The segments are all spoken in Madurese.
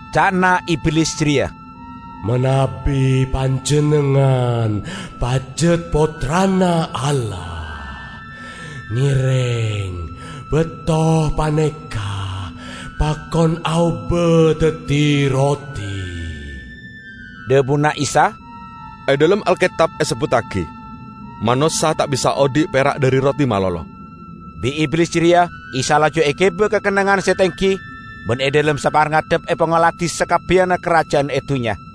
Ca'na Iblis jareya, "Manabi Panjennengngan pajat Pottrana Allah, ngereng bato paneka pakon aoba daddi roti." Dhabuna Isa, "E dhalem Alketab esebbuttagi, 'Manossa ta' bisa odhi' pera' dhari roti malolo.' " Bi' Iblis jareya Isa laju egiba ka kennengngan se tenggi ban e dhalem saparngedep epangoladi sakabbiyanna karaja'an e dunnya.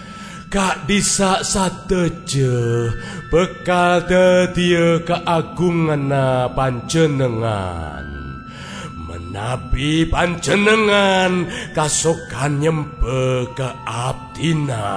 Ka'dhissa' sadaja bakal daddiya kaagunganna Panjennengngan manabi Panjennengngan kasokan nyemba ka abdina."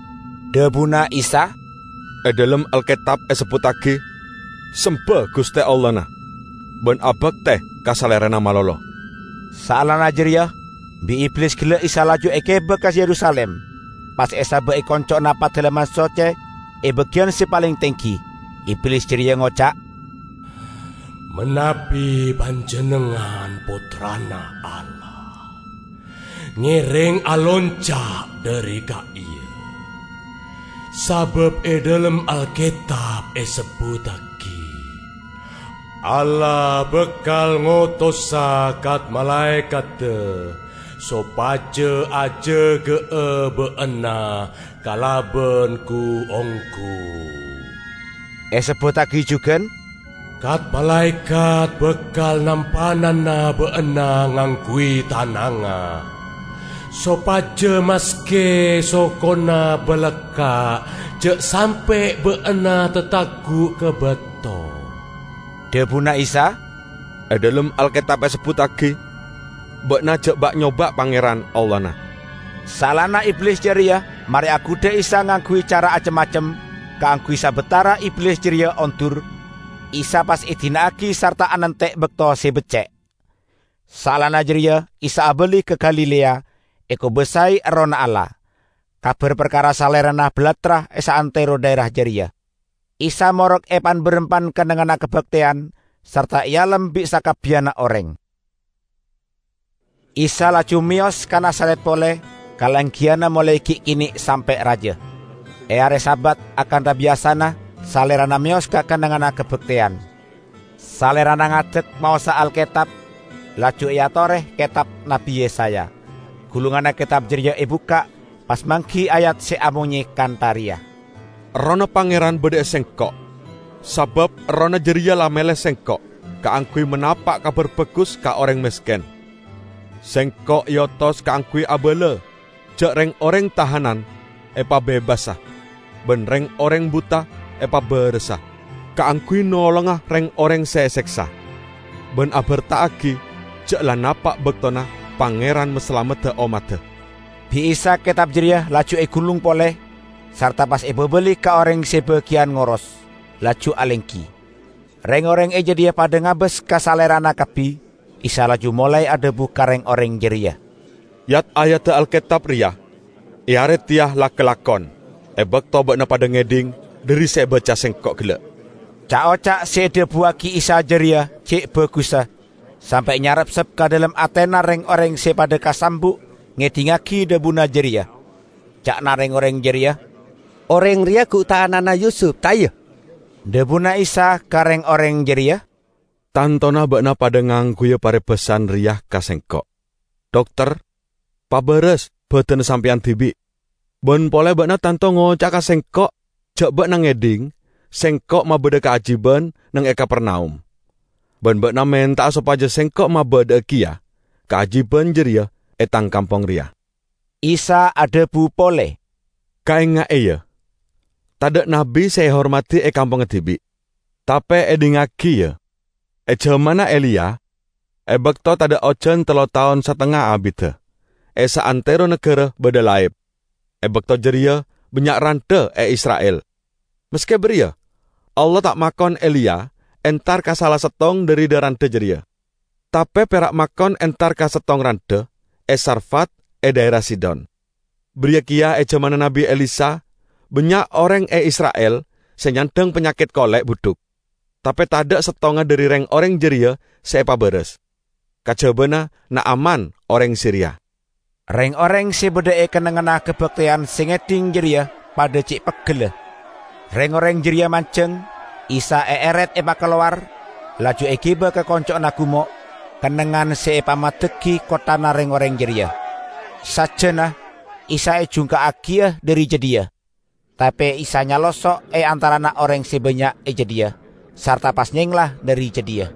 Dhabuna Isa, "E dhalem Alketab esebbuttagi, 'Semba Guste Allahna ban abakte ka Salerana malolo.' " Saellana jareya bi' Iblis gella' Isa laju egiba ka Yerusalim pas esaba' e konco'na Padalemman Socce e bagiyan se paleng tenggi; Iblis jareya ngoca', "Manabi Panjennengngan Pottrana Allah, ngereng alonca' dhari ka'iya. Sabab e dhalem Alketab esebbuttagi, 'Allah bakal ngotosa kat-malaekadda sopaja ajaga'a Ba'na kalaban gu-onggu.' Esebbuttagi jugan, 'Kat-malaekat bakal nampanana Ba'na ngangguy tanangnga, sopaja maske sokona balakka' ja' sampe' ba'na tatagguk ka bato.' " Dhabuna Isa, "E dhalem Alketab esebbuttagi, 'Ba'na ja' ba'-nyoba' Pangeran, Allahna.' " Saellana Iblis jareya mare agudha Isa ngangguy cara acem-macem, kaangguy sabatara Iblis jareya ondur, Isa pas edina'agi sarta anante' bakto se becce'. Saellana jareya Isa abali ka Galilea, ekobasae Errohna Allah. Kabar parkara Salerana balattra e saantero dhaera jareya. Isa morok e pan-barampan kennengnganna kabakteyan, sarta ealem bi' sakabbiyanna oreng. Isa laju meyos ka Nazaret pole, kalenggiyanna molae gi' kene' sampe' raja. E are Sabat, akantha biyasana Salerana meyos ka kennengnganna kabakteyan. Salerana ngadek maosa Alketab, laju eatore ketab Nabbi Yesaya. Gulunganna ketab jareya ebukka', pas manggi ayat se amonye kantha reya, "Errohna Pangeran badha e Sengko', sabab Errohna jareya la mele Sengko' kaangguy manapa' Kabar Bagus ka oreng mesken. Sengko' eotos kaangguy abala ja' reng-oreng tahanan epabebasa ban reng-oreng buta epabarasa; kaangguy nolonga reng-oreng se eseksa ban aberta'agi ja' la napa' baktona Pangeran masalamedda ommadda." Bi' Isa ketab jareya laju egulung pole, sarta pas epabali ka oreng se bagiyan ngoros, laju alenggi. Reng-oreng e jadhiya padha ngabas ka Salerana kabbi. Isa laju molae adhabu ka reng-oreng jareya, "Yat-ayadda Alketab reya e are teya la kalakon e bakto ba'na padha ngedhing dhari se ebaca Sengko' gella'." Ca'-oca' se edhabuwagi Isa jareya ce' bagussa, sampe' nyarepsep ka dhalem atena reng-oreng se padha kasambu' ngedhingngagi dhabuna jareya. Ca'na reng-oreng jareya, "Oreng reya gu ta' ana'na Yusup, ta' iya?" Dhabuna Isa ka reng-oreng jareya, "Tantona ba'na padha ngangguya parebasan reya ka Sengko', 'Dokter, pabaras badanna Sampeyan dibi'.' Ban pole ba'na tanto ngoca'a ka Sengko' ja' ba'na ngedhing Sengko' mabadha kaajiban neng e Kapernaum ban ba'na menta'a sopaja Sengko' mabadha'a keya kaajiban jareya e Tang kampong reya." Isa adhabu pole, "Kaenga'e, ya, tadha' nabbi se ehormadi e kampongnga dibi'. Tape edhingngagi, ya: e jamanna Eliya, e bakto tadha' ojan tello taon satengnga abidda, e saantero nagara badha laep. E bakto jareya bannya' randha e Isra'il. Maske bariya, Allah ta' makon Eliya entar ka sala settong dhari dha-randha jareya, tape pera' makon entar ka settong randha e Sarfat e dhaera Sidon. Bariya keya e jamanna Nabbi Elisa bannya' oreng e Isra'il se nyandhang panyaket kole' budhuk; tape tadha' settonga dhari reng-oreng jareya se epabaras, kajabana Na'aman oreng Siria." Reng-oreng se badha e kennengnganna kabakteyan se ngedhing jareya padha ce' peggella. Reng-oreng jareya manjeng, Isa eeret epakalowar, laju egiba ka konco'na gumo', kennengngan se epamaddeggi kotthana reng-oreng jareya. Sajjana Isa ejungka'agiya dhari jadhiya. Tape Isa nyalosso' e antarana oreng se bannya' e jadhiya, sarta pas nyengla dhari jadhiya.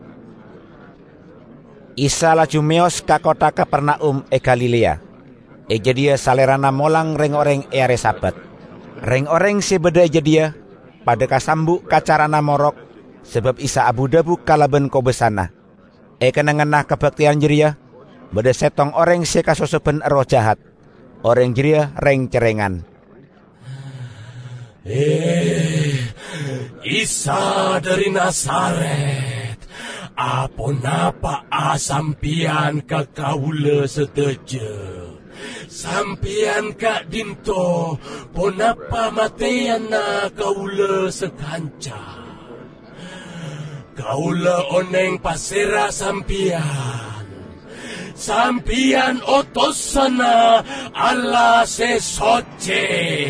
Isa laju meyos ka kottha Kapernaum e Galilea. E jadhiya Salerana molang reng-oreng e are Sabat. Reng-oreng se badha e jadhiya padha kasambu' ka carana morok, sabab Isa abu-dhabu kalaban kobasana. E kennengnganna kabakteyan jareya badha settong oreng se kasosoban erroh jahat. Oreng jareya reng-cerrengan, "He, Isa dhari Nazaret, aponapa'a Sampeyan ka kaula sadaja? Sampeyan ka'dhinto' ponapa mateyana kaula sakanca? Kaula oneng pasera Sampeyan: Sampeyan otosanna Allah se socce!"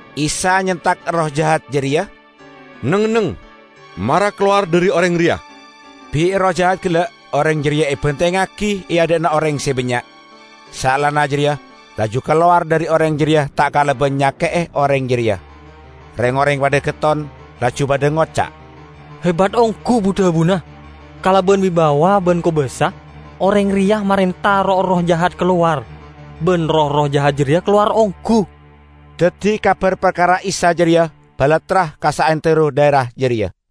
Isa nyentak erroh jahat jareya, "Neng-enneng! Mara kalowar dhari oreng reya!" Bi' erroh jahat gella' oreng jareya ebantengngagi e adha'na oreng se bannya', saellana jareya laju kalowar dhari oreng jareya ta' kalaban nyake'e oreng jareya. Reng-oreng padha getton, laju padha ngoca', "Hebat onggu bu-dhabuna. Kalaban wibawa ban kobasa oreng reya marenta roh-erroh jahat kalowar, ban roh-erroh jahat jareya kalowar onggu!" Daddi kabar parkara Isa jareya balattra ka saantero dhaera jareya.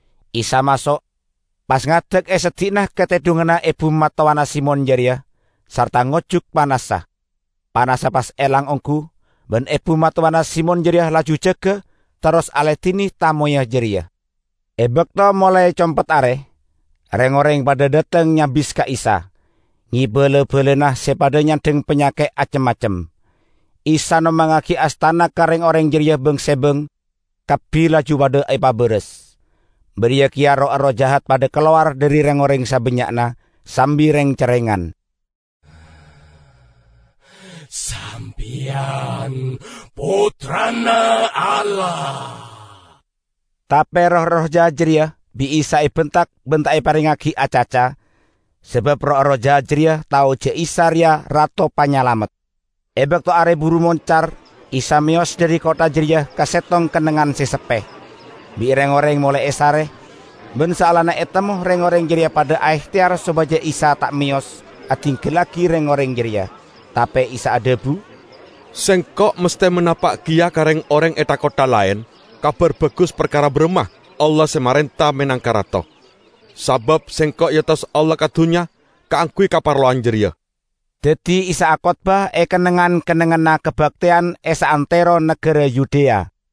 Isa maso', pas ngadek e seddi'na katedhunganna ebu mattowana Simon jareya, sarta ngojuk panassa. Panassa pas elang onggu, ban ebu mattowana Simon jareya laju jaga terros aladine tamoyya jareya. E bakto molae compet are, reng-oreng padha dhateng nyabis ka Isa, ngeba la-balana se padha nyandhang panyaket acem-macem. Isa nompangngagi astana ka reng-oreng jareya bang-sebang, kabbi laju padha epabaras. Bariya keya roh-erroh jahat padha kalowar dhari reng-oreng sabannya'na, sambi reng-cerrengan, "Sampeyan Pottrana Allah!" Tape roh-erroh jahat jareya bi' Isa ebentak ban ta' eparengngagi acaca, sabab roh-erroh jahat jareya tao ja' Isa reya Rato Panyalamet. E bakto are buru moncar Isa meyos dhari kottha jareya ka settong kennengngan se seppe. Bi' reng-oreng molae esare, ban saellana etemmo reng-oreng jareya padha aehteyar sopaja Isa ta' meyos adinggallagi reng-oreng jareya. Tape Isa adhabu, "Sengko' masthe manapa' keya ka reng-oreng e tha-kottha laen Kabar Bagus parkara baramma Allah se marenta menangka Rato, sabab Sengko' eotos Allah ka dunnya kaangguy kaparlowan jareya." Daddi Isa akotbah e kennengngan-kennengnganna kabakteyan e saantero nagara Yudea.